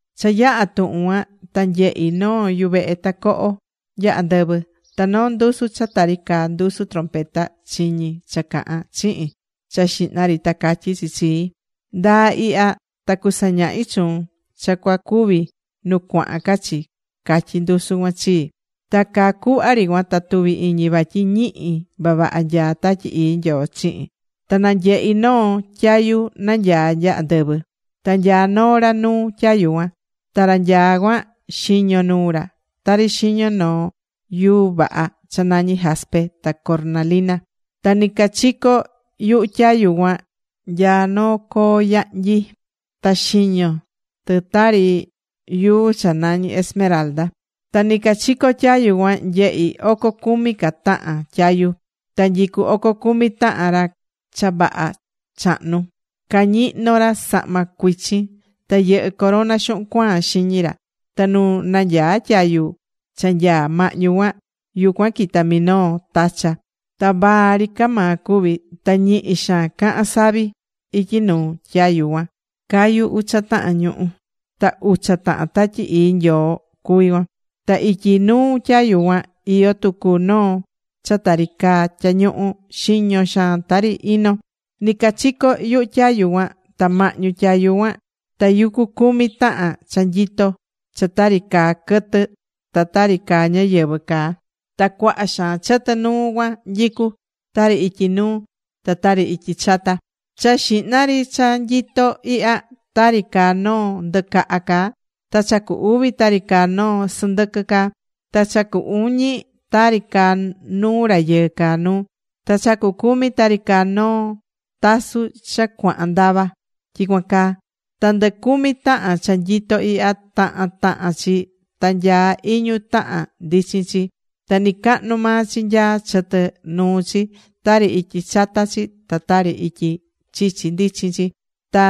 Cha yaha̱ tuhun cuan, ta nyehi̱ noo yuvehe tacoho nya andɨvɨ. Ta noo ndusu cha tari caa ndusu trompeta chiñi̱ cha cahán chihin cha xihna ri ta catyí chi chii: ―Nda̱a ihya ta cusañahi chuun cha cuacuvi nu cuahan ca chi ―catyí ndusu cuan chii. Ta caa cuhva ri cuan ta tuvi̱ iñi vatyi ñihi vavaha nyaá Tatyi Ii Nyoo chihin. Ta nanyehi̱ noo tyayu nanyaá nya andɨvɨ. Ta nyaá noo ra nuu tyayu cuan. Ta ra nyaá cuan, xiño nuu ra tari xiño noo yuu vaha cha nañí jaspe ta cornalina. Ta nɨcachico yuhu tyayu cuan nyaá noo coo yahnyi, ta xiño tɨ tari yuu cha nañí esmeralda. Ta nɨcachico tyayu cuan nyehi̱ oco cumi ca tahan tyayu. Ta nyicú oco cumi tahan ra cha vaha chahnu. Cañihnó ra sahma cuichin. Ta yɨhɨ́ corona xuhun cuaan xiñi ra. Ta nu nanyaá tyayu cha nyaá mahñu cuan, yucuan quitá minoo tacha. Ta vaa ri ca maa cuví. Ta ñihi xaan cahán savi. Ityi nuu tyayu cuan cayú ucha tahan ñuhu̱. Ta ucha tahan Tatyi Ii Nyoo cuví cuan. Ta ityi nuu tyayu cuan iyó tucu noo cha tari caa tyañuhu, xiño xaan tari ino. Nicachico yuhu tyayu cuan ta mahñu tyayu cuan, tayucú cumi tahan cha nyitó cha tari caa quɨtɨ ta tari caa ñáyɨvɨ caa. Ta cuaha xaan chɨtɨ nuu cuan nyicú, tari ityi nuu ta tari ityi chata. Cha xihna ri cha nyitó ihya, tari caá noo ndɨcaha caá. Ta cha cu uvi tari caá noo sɨndɨquɨ caá. Ta cha cu uñi, tari caá nuu rayɨɨ caá nuu. Ta cha cucumi tari caá noo tasu cha cuahan ndava, tyicuan caá. Ta ndɨ cumi tahan cha nyitó ihya, tahan tahan chi ta nyaá iñu tahan ndichin chi. Ta nɨcahnu maa chi nyaá chɨtɨ nuu chi, tari ityi chata chi ta tari ityi chichi ndichin chi. Ta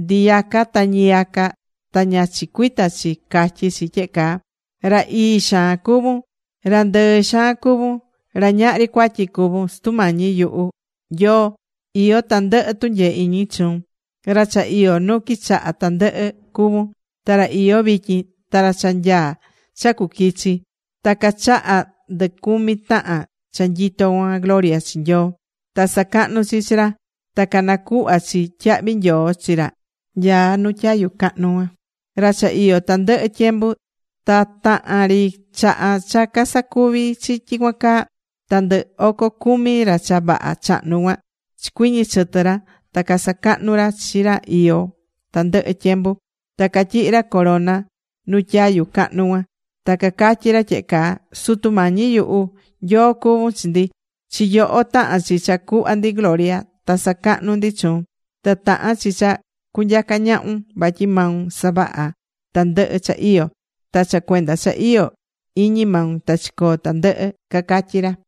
ndiyaca ta ñiyaca ta ña chicuita chi catyí chi tyehe caa: Ra ii xaan cuvún, ra ndɨɨ xaan cuvún, ra ñahri cuatyi cuvún, Sutu Mañi yuhu, Nyoo, iyó tandɨhɨ tunyee iñi chuun. Ra cha iyó nu quichaha tandɨhɨ cuvún, Ta ra iyó vityin. Ta ra cha nyaá cha cuquichi. Ta cachahá ndɨ cumi tahan cha nyitó cuan gloria chi Nyoo. Ta sacahnú chi chi ra, ta canacuhvá chi tyahvi nyoo chi ra nyaá nu tyayu cahnu cuan, ra cha iyó tandɨhɨ tyembu. Ta tahan ri chaha cha casacuvi̱ chi tyicuan caa, ta ndɨ oco cumi ra cha vaha chahnu cuan chicuiñi chɨtɨ̱ ra ta casacahnu̱ ra chi ra iyó tandɨhɨ tyembu. Ta catyihi̱ ra corona ra nu tyayu cahnu cuan. Ta cacatyí ra tyehe caa: Sutu Mañi nyuhu, Nyoo cuvún chi ndi. Chi yoho tahán chi cha cuhva ndi gloria, ta sacahnú ndi chuun. Ta tahán chi cha cunyaca ñahun. Vatyi maun savaha̱ tandɨhɨ cha iyó. Ta cha cuenda cha iyó iñi maun ta chicoo̱ tandɨhɨ, cacatyí ra.